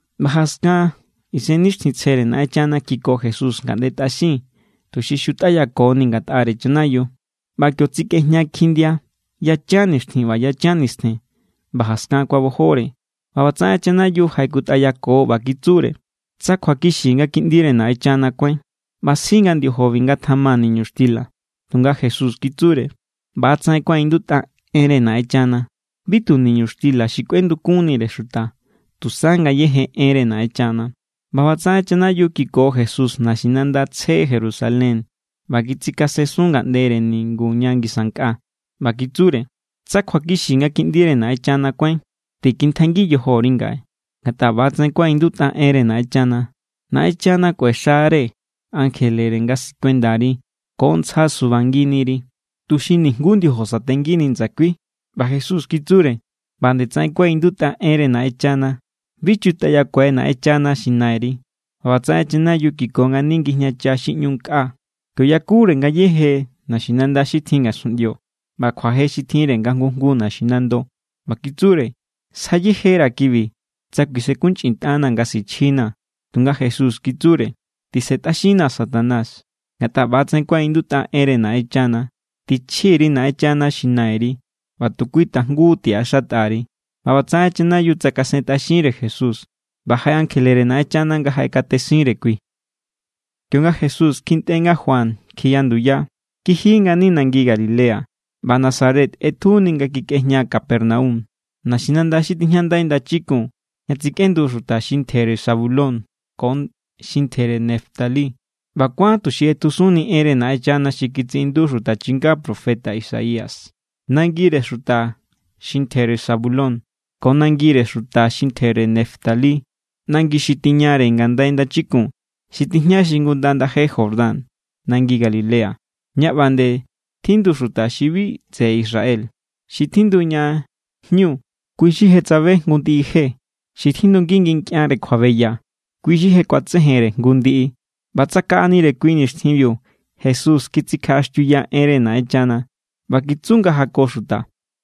ꞌBa jaskan Isennixtjintsjere Naꞌenchana kiko Jesús ngaꞌnde tꞌaxin, tuxi xutꞌayakoni ngatꞌare chanayiu. ꞌBa kio tsikꞌejña kjindia yachan nixtjin ꞌba yachan nistjen, ꞌba jaskan kuabojore. ꞌBa ꞌbatsaꞌen chanayiu jaꞌekutꞌayako ꞌba kitsure: —Tsa kjuakixi nga Kiꞌndire Naꞌenchana kuáin, ꞌba sji nga ndiojobi ngatjama niñuxtila. Tunga Jesús kitsure: —ꞌBa=tsaꞌen kuaꞌindutꞌa enre Naꞌenchana: “Bi tu niñuxtila xi kꞌuendukunnire xuta, tusa ngayéje enre Naꞌenchana.” ꞌBa ꞌbatsaꞌen chanayiu kiko Jesús naxinanda tsje Jerusalén ꞌba kitsikasensun ngaꞌndere ningu ña ngisa nkꞌa. ꞌBa kitsure: —Tsa kjuakixi nga Kiꞌndire Naꞌenchana kuáin, tikintjaingi yojori ngaꞌe. Ngatꞌa ꞌba=tsaꞌen kuaꞌindutꞌa enre Naꞌenchana: Naꞌenchana kꞌuexare ankjelere nga sikuendari. Ko ntsja subanginiri, tuxi nijnguú ndiojo satengini ndsakui. ꞌBa Jesús kitsure: —ꞌBa nde tsaꞌen kuaꞌindutꞌa enre Naꞌenchana: “Bi chutꞌayakuai Naꞌenchana xi Nairi.” ꞌBa ꞌbatsaꞌen chanayiu kiko ngani ngijñacha xi ꞌñu nkꞌa. Kio yakure ngayéje naxinanda xi tjin ngasunꞌndio ꞌba kjuaje xi tjinre nga jngu jngu naxinando. ꞌBa kitsure: —Sja yejera̱ kibi tsa kuisenkunchꞌintꞌanaa̱ nga sichjinaa̱. Tunga Jesús kitsure: —Tisentꞌaxinnaa̱, Satanás, ngatꞌa ꞌba=tsaꞌen kuaꞌindutꞌa enre Naꞌenchana: “Tichji_ri Naꞌenchana xi Nairi, ꞌba tu kui tajngu tiꞌaxatꞌa_ri.” ꞌBa ꞌbatsaꞌen chanayiu tsakasentꞌaxinre Jesús. ꞌBa jaꞌe ankjelere Naꞌenchana nga jaꞌekatesinre kui. Kionga Jesús kjintꞌe nga Juan kjiya nduya, kiji ngani nangi Galilea. ꞌBa Nazaret ꞌetjuni nga kikꞌejña Capernaum, naxinanda xi tijñandai ndachikun ña tsikꞌendu xuta xi ntjere Zabulón ko xi ntjere Neftalí. ꞌBa kuán tuxi ꞌetjusunni enre Naꞌenchana xi kitsiꞌindu xuta chinga profeta Isaías: Nangire xuta xi ntjere Zabulón, ko nangire xuta xi ntjere Neftalí, nangi xi tiñare ngandai ndachikun, xi tijña xingunda ndaje Jordán, nangi Galilea, ña ꞌba nde tjindu xuta xi bi tseꞌe Israel. Xi tjindu ña jñu, kui= xi je tsabe jngu ndiꞌi je. Xi tjindungi nkꞌianre kjuabeya, kui= xi je kuatsejenre jngu ndiꞌi. ꞌBa tsakaꞌanire kui nixtjinbiu Jesús kitsikjaꞌaxtiuya enre Naꞌenchana. ꞌBa kitsu nga jako xuta: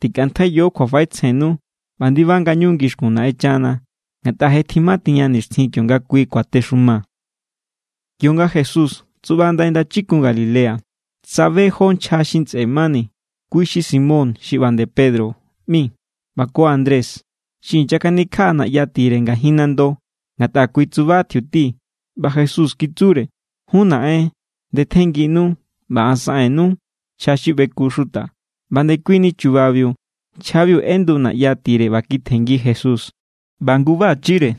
—Tikꞌantjaiyo kjuafaꞌetsjennu ꞌba ndiba ngañu ngixkun Naꞌenchana, ngatꞌa je tjimatiña nixtjin kionga Kui kuatexuma. Kionga Jesús tsuꞌba ndai ndachikun Galilea, tsabe jó nchja xi ntsꞌe mani, kui xi Simón xi ꞌba nde Pedro ꞌmi ꞌba ko Andrés. Xi inyakanikjaꞌa naꞌya tire ngajin nando, ngatꞌa kui tsuba tjiuti. ꞌBa Jesús kitsure: —Jun naꞌen, ndetjennginu ꞌba an saꞌen_nuu̱ nchja xi ꞌbeku xuta. ꞌBa ndekuini chubabiu nchjabiu ꞌendu naꞌya tire ꞌba kitjenngi Jesús. ꞌBa ngubachire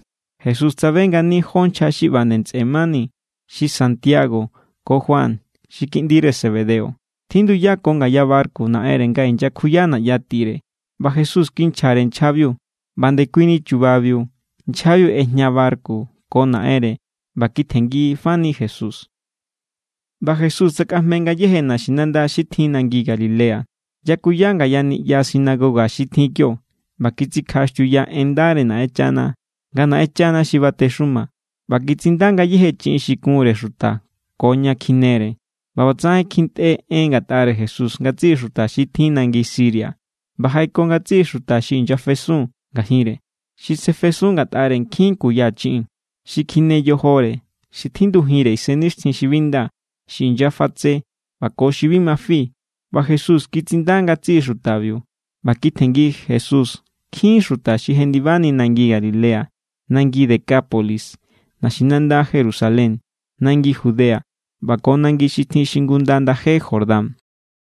Jesús tsabe ngani jó nchja xi ꞌba nde ntsꞌe mani xi Santiago ko Juan xi kiꞌndire Zebedeo. Tjinduyako ngaya barku naꞌenre nga inyakjuya naꞌya tire. ꞌBa Jesús kinchjare nchjabiu. ꞌBa ndekuini chubabiu nchjabiu ꞌejña barku ko naꞌenre ꞌba kitjenngifani Jesús. ꞌBa Jesús tsakꞌajme ngayéje naxinanda xi tjin nangi Galilea. Yakuya ngaya niꞌya sinagoga xi tjin kio, ꞌba kitsikjaꞌaxtiuya en ndare Naꞌenchana nga Naꞌenchana xi batexuma, ꞌba kitsinda ngayéje chiꞌin xi kunre xuta ko ña kjinere. ꞌBa ꞌbatsaꞌen kjintꞌe en ngatꞌare Jesús ngatsiꞌi xuta xi tjin nangi Siria. ꞌBa jaꞌeko ngatsiꞌi xuta xi inyafesun ngajinre, xi sefesun ngatꞌare nkjin kuya chiꞌin, xi kjine yojore, xi tjindujinre isennixtjin xi bi nda, xi inyafatse, ꞌba ko xi bi ma fi. ꞌBa Jesús kitsinda ngatsiꞌi xutabiu. ꞌBa kitjenngi Jesús nkjin xuta xi jendibani nangi Galilea, nangi Decápolis, naxinanda Jerusalén, nangi Judea, ꞌba ko nangi xi tjin xingunda ndaje Jordán.